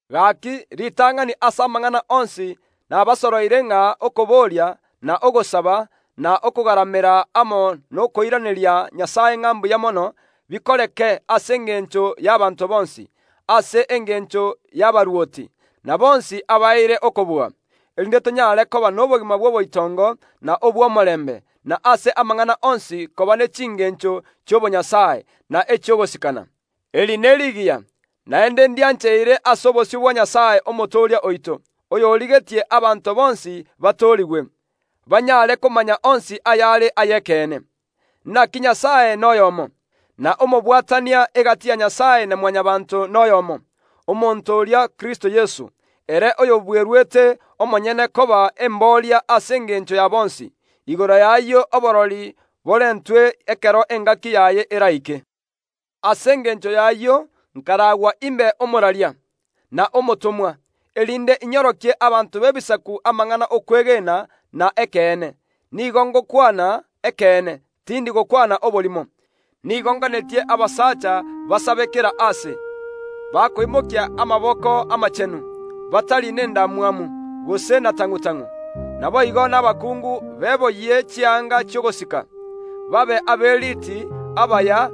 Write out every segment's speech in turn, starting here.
Gaaki, ritang’ani ase amang’ana onsi nabasoroire ng’a okoboria, na ogosaba, na okogaramera amo nokoiraneria Nyasae ng’a mbuya mono, bikoreke ase engencho y’abanto bonsi, ase engencho y’abarwoti, na bonsi abaeire okobua, erinde tonyaare koba nobogima bw’oboitongo na obw’omorembe, na ase amang’ana onsi koba ne chingeencho chi’obonyasae, na echi’ogosikana. Eri nerigiya, naende ndiancheire ase obosio bwa Nyasae, Omotooria oito, oyorigetie abanto bonsi batoorigwe, banyaare komanya onsi ayare ay’ekeene. Inaki Nyasae noyoomo, na omobwatania gati ya Nyasae na Mwanyabaanto noyoomo, omonto oria Kristo Yeso ere oyobweruete omonyene koba embooria ase engencho ya bonsi. Igoro y’ayio oborori borentwe ekero engaki yaye eraike. Ase engencho y’ayio nkaragwa imbe omworokia, na omotomwa, erinde inyorokie abanto b’Ebisaku amang’ana y’okwegena na ekeene; nigo ngokwana ekeene, tindi gokwana oborimo. Nigo nganetie abasacha basabe kera aase, bakoimokia amaboko amachenu, batari nendamwamu, gose na tang’u‐tang’u. Naboigo nabakungu beboyie chianga chi’ogosika, babe aberiiti na abaya,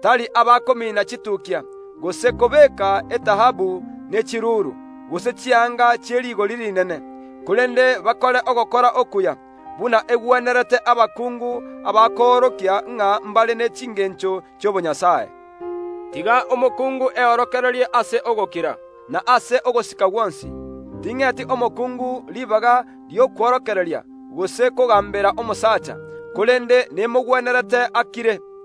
tari abakomina chituukia, gose kobeeka etaabu ne chiruuru, gose chianga chie rigori rinene, korende bakore ogokora okuya, buna egwenerete abakungu abakoorokia ng’a mbare ne chingeencho chi’obonyasae. Tiga omokungu eorokererie ase ogokira, na ase ogosika gwonsi. Ting’eti omokungu ribaga ri’okworokereria, gose kogaambera omosacha, korende nemogwenerete akire,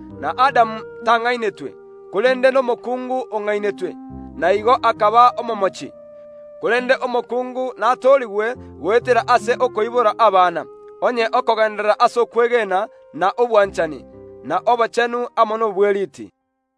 Na Adamu tang’ainetwe, korende nomokuungu ong’ainetwe, na igo akaba omomochi. Korende omokungu natoorigwe goetera ase okoibora abana onye okogeenderera ase okwegena, na obwanchani, na obochenu amo nobweriiti.